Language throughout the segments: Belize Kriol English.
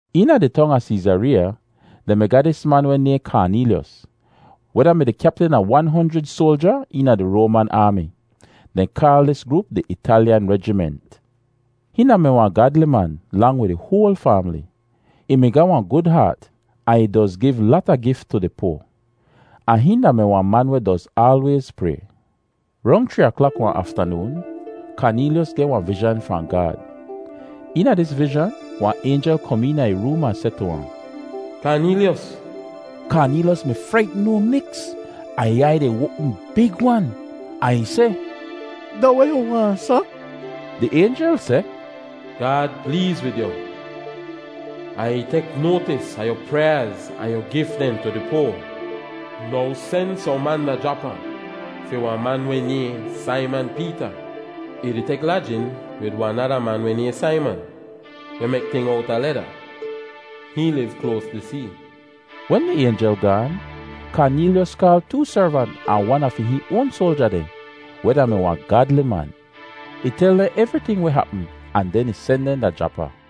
Eena di tong a Seezareeya, dehn mi ga dis man weh nayhn Kaaneelyos, weh da-mi di kyaptin a wan honjrid soalja eena di Roaman aami. Dehn kaal dis groop di Italyan Rejiment. Hihn da-mi wahn gaadli man, lang wid ih hoal faamli. Ih mi ga wahn gud haat ahn ih doz giv lata gif tu di poa. Ahn hihn da-mi wahn man weh doz aalwayz pray. Rong chree aklak wahn aftanoon, Kaaneelyos geh wahn vizhan fahn Gaad. Eena dis vizhan wahn aynjel kom eena ih room ahn seh tu ahn, “Kaaneelyos!” Kaaneelyos mi fraitn no miks ahn ih aiy dehn oapm big-wan, ahn ih seh, “Da weh yu waahn, sa?” Di aynjel seh, “Gaad pleez wid yu, ahn ih tek noatis a yu pryaaz ahn yu gif dehn tu di poa. Now, sen sohn man da Japa fi wahn man weh nayhn Saiman Peeta. Ih di tek lajin wid wahn nada man weh nayhn Saiman, weh mek ting owta leda. Hihn liv kloas di see.” Wen di aynjel gaan, Kaaneelyos kaal too servant ahn wan a fi hihn oan soalja dehn, weh da-mi wahn gaadli man. Ih tel dehn evriting weh hapm ahn den ih sen dehn da Japa.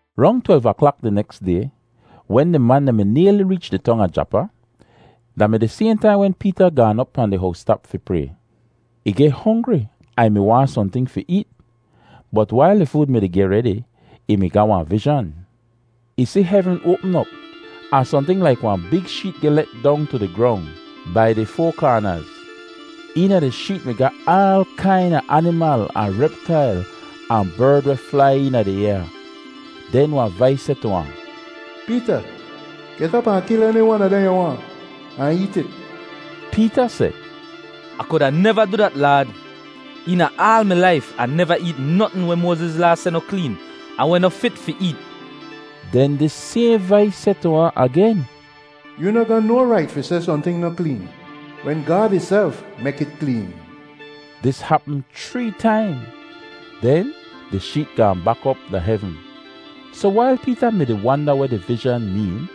Rong twelv aklak di neks day, wen di man dehn mi nayli reech di tong a Japa, da mi di sayhn taim wen Peeta gaan op pahn di howstap fi pray. Ih geh hongri ahn ih mi waahn sohnting fi eet. Bot wail di food mi-di geh redi, ih mi ga wahn vizhan. Ih si hevn oapm op, ahn sohnting laik wahn big sheet geh let dong tu di grong bai di foa kaanaz. Eena di sheet mi ga aal kaina animal ahn reptail ahn berd weh flai eena di ayaa. Den wahn vais seh tu ahn, “Peeta, get op ahn kil eni wan a dehn yu waahn, ahn eet it.” Peeta seh, “Ah kuda neva du dat, Laad. Eena aal mi laif Ah neva eet notn weh Moaziz Laa seh noh kleen ahn weh noh fit fi eet.” Den dis sayhn vais seh tu ahn agen, “Yoo noh ga no rait fi seh sohnting noh kleen wen Gaad ihself mek it kleen.” Dis hapm chree taim, den di sheet gaahn bak op da hevn. Soh wail Peeta mi-di wanda weh di vizhan meen,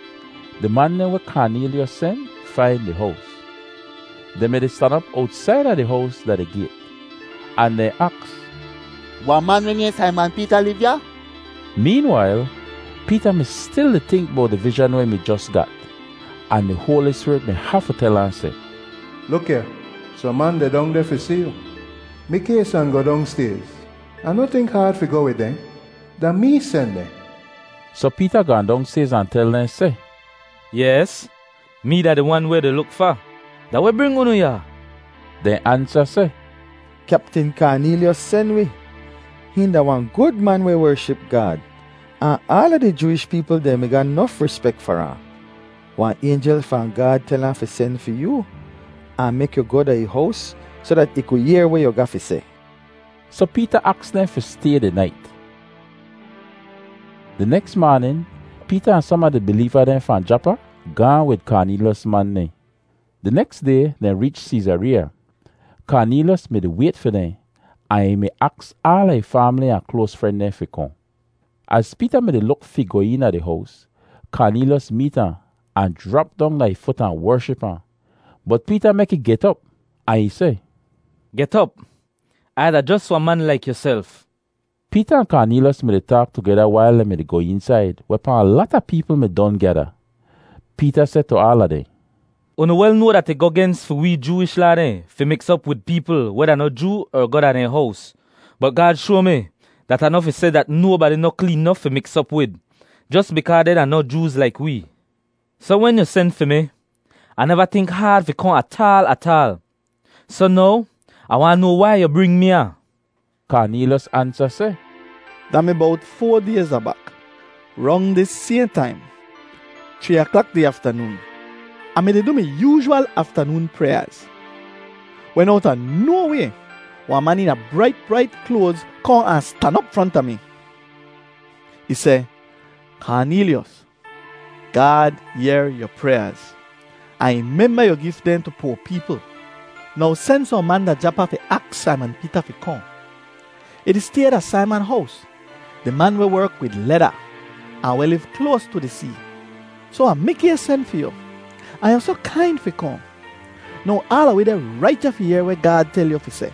di man dehn weh Kaaneelyos sen, fain di hows. Dehn mi-di stan op owtsaida di hows da di gayt, ahn dehn aks, “Wahn man weh nayhn Saiman Peeta liv ya?” Meenwail, Peeta mi stil di tink bowt di vizhan weh ih mi jos gat. Ahn di Hoali Spirit mi hafu tel ahn seh, “Luk ya, sohn man deh dong deh fi si yu. Mikays ahn goh dongstayz, ahn noh tink haad fi goh wid dehn. Da mee sen dehn.” Soh Peeta gaahn dongstayz ahn tel dehn seh, “Yes, mee da di wan weh yu di luk fa. Da weh bring unu ya?” Dehn ansa seh, “Kyaptin Kaaneelyos sen wi. Hihn da wahn gud man weh wership Gaad, ahn aala di Jooish peepl dehn mi ga nof rispek far ahn. Wahn aynjel fahn Gaad tel ahn fi sen fi yoo, ahn mek yu goh da ih hows soh dat ih ku yehr weh yu ga fi seh.” Soh Peeta aks dehn fi stay di nait. Di neks maanin Peeta ahn som a di bileeva dehn fahn Japa gaahn wid Kaaneelyos man dehn. Di neks day dehn reech Seezareeya. Kaaneelyos mi-di wayt fi dehn ahn ih mi aks aala ih faamli ahn kloas fren dehn fi kohn. Az Peeta mi-di luk fi goh eena di hows, Kaaneelyos meet ahn, ahn jrap dong da ih fut ahn wership ahn. Bot Peeta mek ih get op ahn ih seh, “Get op! Ai da jos wahn man laik yuself.” Peeta ahn Kaaneelyos mi-di taak tugeda wail dehn mi-di goh eensaid, wehpaa wahn lata peepl mi don gyada. Peeta seh tu aala dehn, “Unu wel noa dat ih goh gens fi wee Jooish Laa dehn fi miks op wid peepl weh da noh Joo er goh da dehn hows. Bot Gaad shoa mi dat Ah noh fi seh dat nobadi noh kleen nof fi miks op wid, jos bikaa dehn da noh Jooz laik wee. Soh wen yu sen fi mi, Ah neva tink haad fi kohn ataal ataal. Soh now, Ah waahn noa wai yu bring mi ya.” Kaaneelyos ansa seh, “Da mi bowt foa dayz abak, rong dis sayhn taim, chree aklak di aftanoon, Ah mi-di du mi yoozhwal aftanoon pryaaz, wen owta no way wahn man eena brait brait kloaz kohn ahn stan op fronta mi. Ih seh, ‘Kaaneelyos! Gaad yehr yu pryaaz, ahn ih memba yu gif dehn tu poa peepl. Now sen sohn man da Japa fi aks Saiman Peeta fi kohn. Ih di stay da Saiman hows, di man weh werk wid leda ahn weh liv kloas tu di see.’ Soh Ah mikays sen fi yu, ahn yu soh kain fi kohn. Now aala wi deh rait ya fi yehr weh Gaad tel yu fi seh.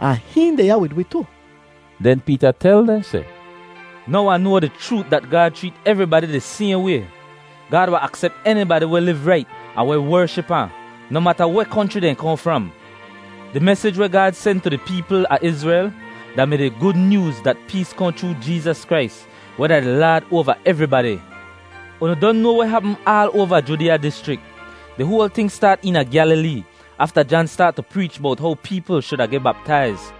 Ah hihn deh ya wid wi tu.” Den Peeta tel dehn seh, “Now Ah noa di chroot dat Gaad chreet evribadi di sayhn way. Gaad wahn aksep enibadi weh liv rait ahn weh wership ahn, noh mata weh konchri dehn kohn fram. Di mesij weh Gaad sen tu di peepl a Izrel da-mi di Gud Nyooz dat pees kohn chroo Jeezas Krais, weh da di Laad oava evribadi. Unu don noa weh hapm aal oava Judeeya dischrik. Di hoal ting staat eena Gyalilee afta Jan staat tu preech bowt how peepl shuda geh baptaiz.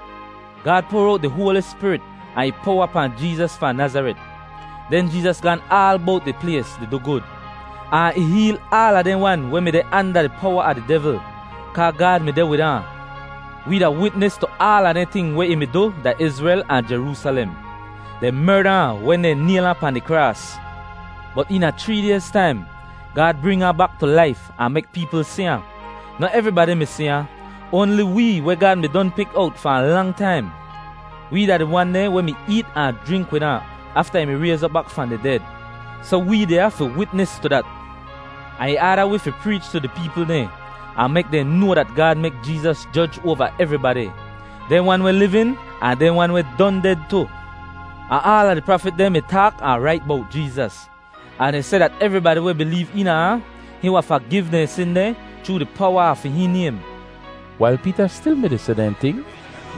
Gaad poar owt di Hoali Spirit ahn ih powa pahn Jeezas fahn Nazaret. Den Jeezas gaan aal bowt di plays di du gud, ahn ih heel aala dehn wan weh mi deh anda di powa a di devl, kaa Gaad mi deh wid ahn. “Wee da witnis tu aala dehn ting weh ih mi du da Izrel ahn Jeroosalem. Dehn merda ahn wen dehn nayl ahn pahn di kraas. Bot eena chree dayz taim, Gaad bring ahn bak tu laif ahn mek peepl si ahn. Noh evribadi mi si ahn, oanli wee weh Gaad mi don pik owt fahn lang taim. Wee da di wan dehn weh mi eet ahn jrink wid ahn afta ih mi rayz op bak fahn di ded, soh wee deh ya fi witnis tu dat. Ahn ih aada wi fi preech tu di peepl dehn, ahn mek dehn noa dat Gaad mek Jeezas joj oava evribadi, dehn wan weh livin ahn dehn wan weh don ded tu. Ahn aala di prafit dehn mi taak ahn rait bowt Jeezas, ahn dehn seh dat evribadi weh bileev eena ahn, hihn wahn fagiv dehn sin dehn chroo di powa a fi hihn naym.” Wail Peeta stil mi-di seh dehn ting,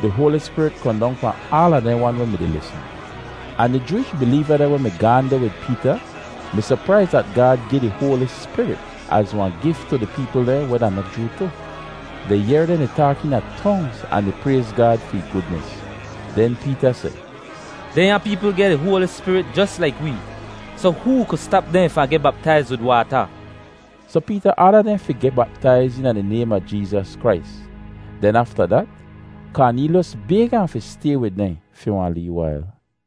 di Hoali Spirit kohn dong pahn aala dehn wan weh mi-di lisn. Ahn di Jooish bileeva dehn weh mi gaahn deh wid Peeta mi sopraiz dat Gaad gi di Hoali Spirit az wahn gif tu di peepl dehn weh da noh Joo tu. Dehn yehr dehn di taak eena tongz ahn di prayz Gaad fi ih gudnis. Den Peeta seh, “Dehnya peepl geh di Hoali Spirit jos laik wee, soh hoo ku stap dehn fahn geh baptaiz wid waata?” Soh Peeta aada dehn fi geh baptaiz eena di naym a Jeezas Krais. Den afta dat, Kaaneelyos bayg ahn fi stay wid dehn fi wahn lee wail.